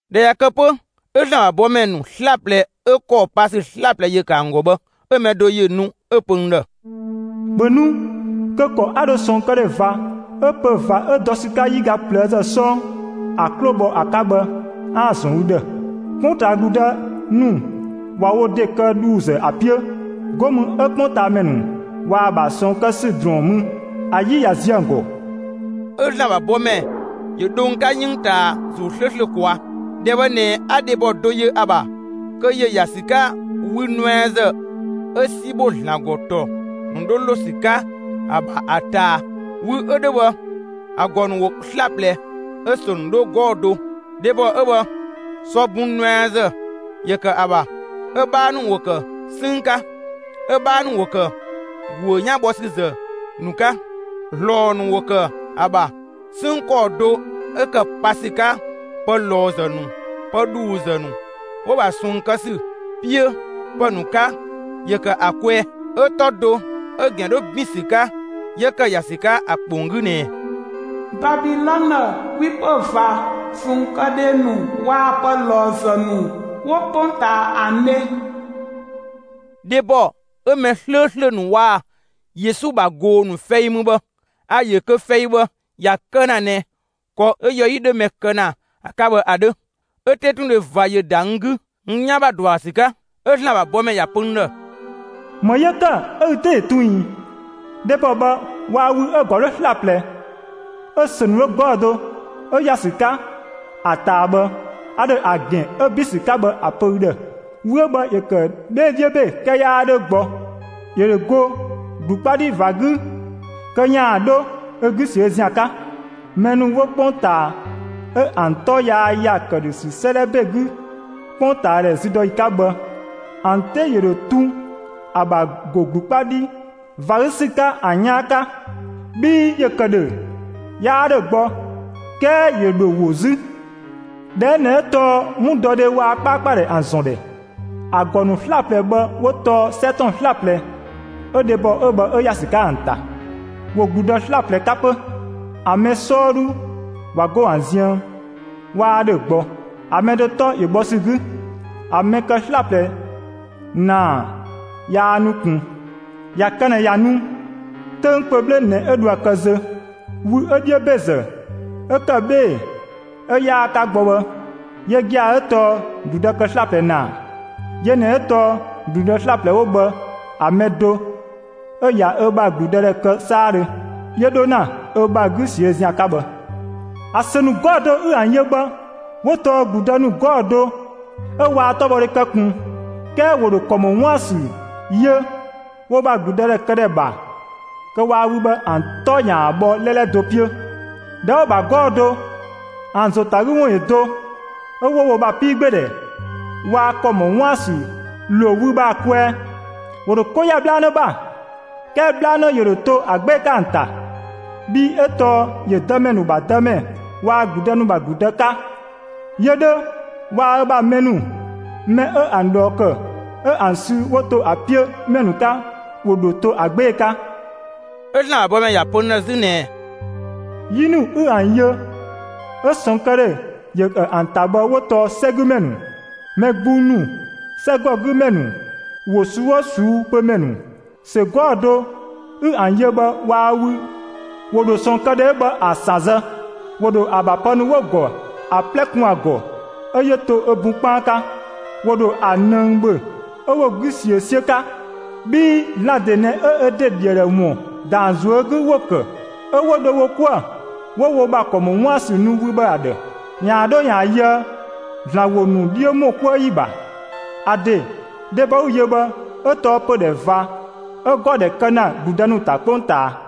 ꞊Dhɛ ꞊ya kë 'pö 'ö ‑Zlan ‑bha bɔmɛ ‑nu 'slaplɛ 'ö ‑kɔɔ pa ‑sü 'slaplɛ ‑yö ‑kë ‑an ‑gɔ bhë, 'ö‑ mɛ do ‑yö nu 'ö‑ pö n ‑dhë: «‑Bhö nu kö ‑kɔ 'a dho ꞊sɔɔnkëdhe ꞊va 'ö pö‑ ꞊va 'ö dɔ ‑sü 'ka 'yiga ꞊plëëzë 'sɔɔ ‑a 'klo‑ bhɔ ‑a 'ka bhë 'aan‑ ‑zɔn ü ‑dhë. 'Kpongtaa ‑gludë ‑nu ꞊wa wo ‑de kë ‑dhuuzë ‑a 'piö, 'go mü 'ö 'kpongtaamɛ ‑nu ꞊waa‑ ‑bha ꞊sɔɔn kë ‑sü ‑drɔɔn mü, ‑a 'yi ꞊ya ziö ‑an ‑gɔ.» 'Ö ‑Zlan ‑bha bɔmɛ ‑yö dho n 'ka 'yënng ꞊taa ‑Zuu 'slööslö ꞊kwaa'. ‑Dhɛ bhë ꞊nɛ 'a dhebɔ do yö ‑a ‑bha kö ‑yö ‑ya ‑sü 'ka wü nuɛazë 'ö 'si ‑bho ‑Zlan ‑gɔ ‑tɔ ‑nu 'dho ‑lo ‑sü 'ka ‑a ‑bha ‑a ꞊taa. Wü 'ö 'dhö bhë ‑a ‑gɔ ‑nu ‑wo 'slaplɛ 'ö‑ ‑sö ‑nu 'dho 'gɔɔ‑ do. Dhebɔ 'ö bhë, sɔ bun nuɛazë ‑yö ‑kë ‑a ‑bha; 'ö‑ 'bhaa ‑nu ‑wo ‑kë 'sënng 'ka, 'ö‑ 'bhaa ‑nu ‑wo ‑kë ‑guö 'yan bho ‑sü ‑zë ‑nu 'ka, ‑zlɔɔ ‑nu ‑wo ‑kë ‑a ‑bha. 'Sënng ‑kɔɔ do 'ö ‑kë pa ‑sü 'ka pë ꞊lɔɔzë ‑nu, pë ‑dhuuzë ‑nu 'wo‑ ‑bha ꞊sɔɔn kë ‑sü 'piö ‑pë ‑nu 'ka ‑yö ‑kë ‑a kwɛɛ. 'Ö 'tɔ do 'ö‑ ‑gɛn 'dho ‑bin ‑sü 'ka 'yö ‑kë ‑ya ‑sü 'ka ‑a ‑kpong 'gü ꞊nɛɛ: Babilɔnë, 'kwipö ꞊va, ꞊sɔɔnkëdhe ‑nu waa‑ pë ꞊lɔɔzë ‑nu 'wo 'kpongtaa ‑an dhe. Dhebɔ 'ö mɛ 'slööslö ‑nu waa‑ Yesu ‑bha ꞊goo‑ ‑nu fɛi mü bhë, a‑ ‑yö kö fɛi bhë ‑ya kë ‑na ꞊nɛ ‑kɔ 'ö yɔ 'yi 'dhö mɛ kë ‑na ‑a 'ka bhë ‑a 'dhö. 'Ö 'tetundhe ꞊va ‑yö ‑da n 'gü n 'yan ‑bha ‑dɔ ‑a ‑bha ‑sü 'ka. 'Ö ‑Zlan ‑bha bɔmɛ ‑ya pö n ‑dhë: «‑Më 'yö ‑kë 'ö ü 'te ‑yö tun ꞊ii? Dhebɔ bhë waa‑ wü 'ö‑ ‑gɔ 'dho 'slaplɛ, 'ö‑ ‑sö ‑nu 'dho 'gɔɔ‑ do, 'ö ‑ya ‑sü 'ka ‑a ꞊taa bhë, a ‑dho ‑a ‑gɛn 'ö ‑bin ‑sü 'ka bhë ‑a pö ü ‑dhë. Wü 'ö bhë ‑yö ‑kë 'bhee‑ 'dhiö ‑be 'kɛɛ 'yaa 'dhö gbɔ, ‑yö ‑dho go ‑glu 'kpa 'dhi ꞊va 'gü kö ‑yaan 'dho ö 'gü ꞊siö' ‑zian 'ka. Mɛ ‑nu 'wo 'kpongtaa 'ö ‑an 'tɔ yaa ‑ya ‑këdhösü 'sëëdhɛ ‑be 'gü 'kpongtaadhɛ züdɔyi 'ka bhë, ‑an 'te ‑yö ‑dho tun ‑a ‑bha ‑go ‑glu 'kpa 'dhi ꞊va 'gü ‑sü 'ka ‑an 'yaan 'ka. Bhii ‑yö ‑kë ‑dhö, 'yaa ‑dhö gbɔ; 'kɛɛ ‑yö ‑dho ‑wo 'zü. ‑Dhɛ 'ö ꞊nɛ 'ö tɔɔ 'wundɔdhe waa‑ 'kpaakpadhɛ ‑an ‑zɔn ‑dhɛ. ‑A ‑gɔ ‑nu 'slaplɛ bhë 'wo tɔɔ 'sɛ ‑tɔn 'slaplɛ 'ö dhebɔ 'ö bhë 'ö ‑ya ‑sü 'ka ‑an ‑ta; ‑wo ‑gludë 'slaplɛ 'ka 'pö. ‑An mɛ 'sɔɔdhu ꞊wa 'go ‑an ziën; 'waa ‑dhö gbɔ, ‑a mɛ do 'tɔ ‑yö bhɔ ‑sü 'gü. ‑A mɛ kë 'slaplɛ ‑naa yaa nu ꞊kun; ꞊ya kë ꞊nɛ ꞊ya nu, 'töng kpö 'bhle ꞊nɛ 'ö dhoë‑ kë zö. Wü 'ö 'dhiö ‑bezë 'ö ‑kë 'bhee‑ 'ö 'yaa‑ 'ka gbɔ bhë, yö gia‑ 'ö tɔɔ ‑gludë kë 'slɛaga ‑naa, yö ꞊nɛ 'ö tɔɔ ‑gludë 'slaplɛ 'wo bhë ‑a mɛ do 'ö ꞊ya ö ‑bha ‑gludëdhɛ kë 'saadhö, 'yö 'dho ‑na ö ‑bha 'gü ꞊siö' ‑zian 'ka bhë. ‑A ‑sö ‑nu 'gɔɔ‑ do 'ü ‑an yö bhë 'wo tɔɔ ‑gludë ‑nu 'gɔɔ‑ do 'ö waa 'tɔbhɔdhe kë ꞊kun 'kɛɛ ‑wo ‑dho ‑kɔ ‑mɔ 'wuën‑ ‑sü yö wo ‑bha ‑gludëdhɛkëdhɛ ‑bha kö waa‑ wü bhë ‑an 'tɔ ‑yaan bhɔ 'lɛlɛ do 'piö. ꞊Dhɛ 'wo‑ ‑bha 'gɔɔ‑ do, ‑an ‑zo ‑ta ‑a 'gü ‑wun ‑yö do, 'ö 'wo wo ‑bha 'piigbeedhɛ waa‑ ‑kɔ ‑mɔ 'wuën‑ ‑sü ‑lo wü bhë ‑a kwɛɛ. ‑Wo ‑dho 'ko ‑ya 'bhlanë ‑bha, 'kɛɛ 'bhlanë ‑yö ‑dho to ‑a 'gbee‑ 'ka ‑an ‑ta; bhii 'ö tɔɔ ‑yö dëmɛ ‑nu ‑bha Dëmɛ waa‑ ‑gludë ‑nu ‑bha ‑gludë 'ka. Yö 'dhö waa‑ ö bha mɛ ‑nu, mɛ 'ö ‑an ꞊dhɔɔ ‑kë, 'ö ‑an sü 'wo ‑to ‑a 'piö ‑mɛ ‑nu 'ka ‑wo dho to ‑a 'gbee‑ 'ka.» 'Ö ‑Zlan ‑bha bɔmɛ ‑ya pö n ‑dhë 'zü ꞊nɛɛ: «'Yi ‑nu 'ü ‑an yö, 'ö ꞊sɔɔnkëdhe ‑yö ‑kë ‑a ‑ta bhë 'wo tɔɔ 'sɛgümɛ ‑nu, mɛ gbung ‑nu, 'sɛgɔgümɛ ‑nu, ‑wo ꞊suu'‑ 'oo ꞊suu'‑ pö ‑mɛ ‑nu. ‑Sö 'gɔɔ‑ do 'ü ‑an yö bhë waa‑ wü ‑wo ‑dho ꞊sɔɔnkëdhe 'ö bhë ‑a ‑san zë; ‑wo ‑dho ‑a ‑bha pë ‑nu 'wo‑ ‑gɔ ‑a 'plɛ kun ‑a ‑gɔ 'ö 'yö to ö bun 'kpaan 'ka. ‑Wo ‑dho ‑a ꞊nëng ‑bhö 'ö 'wo‑ 'gü ꞊siö 'siö 'ka. Bhii ‑Zlan ‑de ꞊nɛ 'ö ö ‑de ‑dhi ‑a ‑dhë ‑wun ‑da ‑an ꞊zuö' 'gü 'wo‑ ‑kë, 'ö 'wo dho wo 'kuë‑, 'wo wo ‑bha ‑kɔ ‑mɔ 'wuën‑ ‑sü nu wü bhë ‑a ‑dhë, ‑yaan 'dho ‑yaan yöë ‑Zlan ‑wo ‑nu 'dhiö ‑mɔ 'kuë ‑yi ‑bha. ‑A ‑de, dhebɔ 'ü‑ yö bhë 'ö tɔɔ pödhɛ ꞊va 'ö ‑gɔ ‑dhɛ kë ‑na ‑gludë ‑nu ‑ta 'kpongtaa.»